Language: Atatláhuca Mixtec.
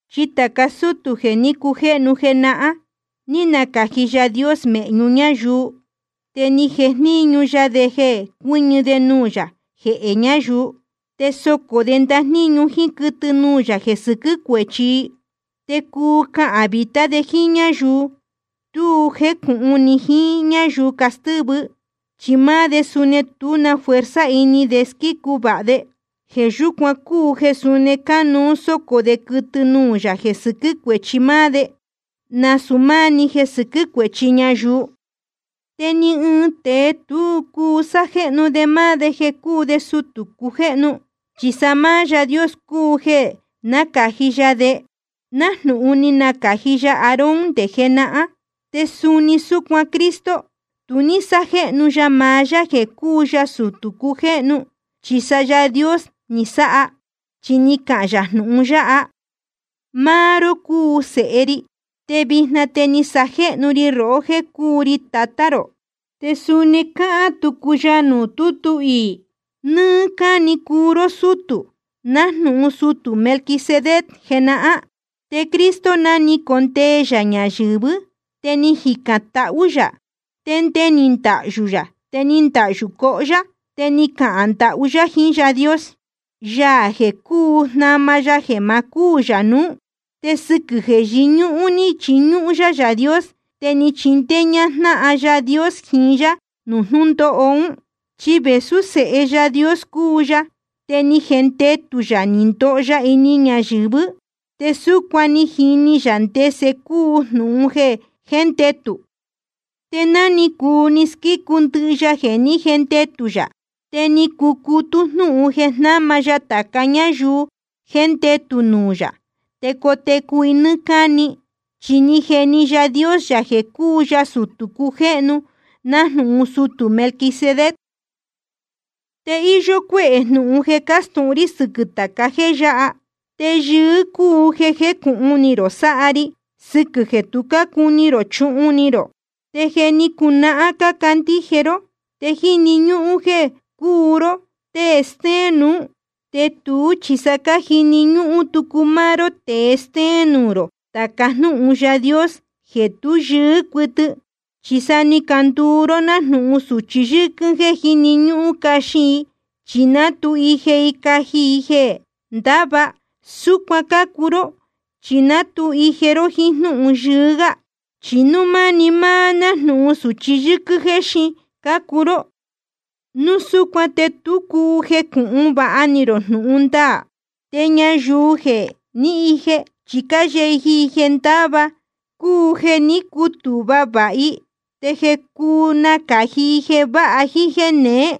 Chi tāca sútū jeē ní cujéhnu jenahán, ni nacāji Yaā Dios de mēhñu ñáyuu, te ni jeni ya de jeē cuɨ́ñɨ de nuū yā jehē ñayuu, te socō de ndajníñu jíín quɨtɨ nuū yā jeē sɨquɨ́ cuēchi i. Te cuu cahān vītá de jíín ñáyuu tu jécūhun ni jiín ñáyuu castɨ́vɨ, chi máá de suni tú na fuerza ini de squícu vāha de. Jeē yúcuan cúu jeē suni cánuú sócō de quɨtɨ nuū yā jeē sɨquɨ́ cuēchi máá de, nasūu máá‑ni jeē sɨquɨ́ cuēchi ñayuu. Te ni ɨɨn tēe tu cúu sájéhnu de máá de jeē cuu de sutū cujéhnu, chi sa máá Yaā Dios cúu jeē nácāji ya de, nájnūhun ni nacāji ya Aarón nde jenahán. Te suni súcuan Cristo, tu ní sájéhnu ya maá yá jeē cuu ya sutū cujéhnu, chi sa Yaā Dios ni sáha, chi ni cahān yā jnūhun yáha: Máá ró cúu Sēhe ri, te vijna te ni sajéhnu ri rohó jéē cúu ri Tatá rō. Te suni cáhán tucu ya nuū tútu iī: Nɨ́ɨ́ cáni cúu ró sútū, nájnūhun sutū Melquisedec jenahán. Te Cristo, ná ni condee ya ñayɨ̄vɨ́, te ni jicān tahú yā, te nde ni ndahyū yā te ni ndahyū cohó yá. Te ni cahān ndahú yá jiín Yaā Dios, Yaā jeē cúu jnama ya jeē ma cúū yā nuú. Te sɨquɨ̄ jeē yɨñúhún ní chiñúhún yá Yaā Dios, te ni chindéé ñájnáhan Yaā Dios jiín yá nuū jnūndóho ún. Chi vēsú Sēhe Yaā Dios cúu ya, te ni jendetū yā ni ndoho ya ini ñayɨ̄vɨ́, te súcuan ni jini yā ndese cúu jnūhun jéndetū. Te ná ni cuu ni squícu ndɨhɨ ya jeē ní jendetū yā, te ni cucutú jnúhun jeē jnáma ya tāca ñáyuu jéndetū nuū yā, te cotecu i nɨ́ɨ́ cáni. Chi ni jeni Yaā Dios yā jeē cúu ya sutū cujéhnu nájnūhun sutū Melquisedec. Te íyó cuéhē jnūhun jeē castūhun rí sɨquɨ̄ tāca jéē yáha. Te yɨɨ́ cúu jeē jécūhun ni rō sáha ri, sɨquɨ̄ jeē tu cácuni rō chuhun ni rō. Te je ni cunahán cácandíje ró, te jíni ñúhún jéē cúu ró tée stéén nuú. Te tuú chi sa cájini ñúhún tucu máá ró tēe stéén nuū rō tāca jnúhun Yaā Dios jeē tú yɨɨ́ cuɨtɨ. Chi sa ni canduu ró nájnūhun sūchi yɨ́quɨ́n jéē jíni ñúhún caxin i, chi ná tu ije i caji i jeē ndáva. Súcuan cácuu ró chi ná tu ije ró jíín jnúhun yɨɨ́ gá. Chi núu máni máá nájnūhun sūchi yɨ́quɨ́n jéxin cácuu ró, núu súcuan te tu cúu jecūhun vāha ni rō jnūhun ndaā. Te ñayuu jeē jé ni ije, chi cáyeji i jeē ndáva, cúu jeē ní cutūhva vāha i te je cúu nácāji i jeē váha jíín jéē neé.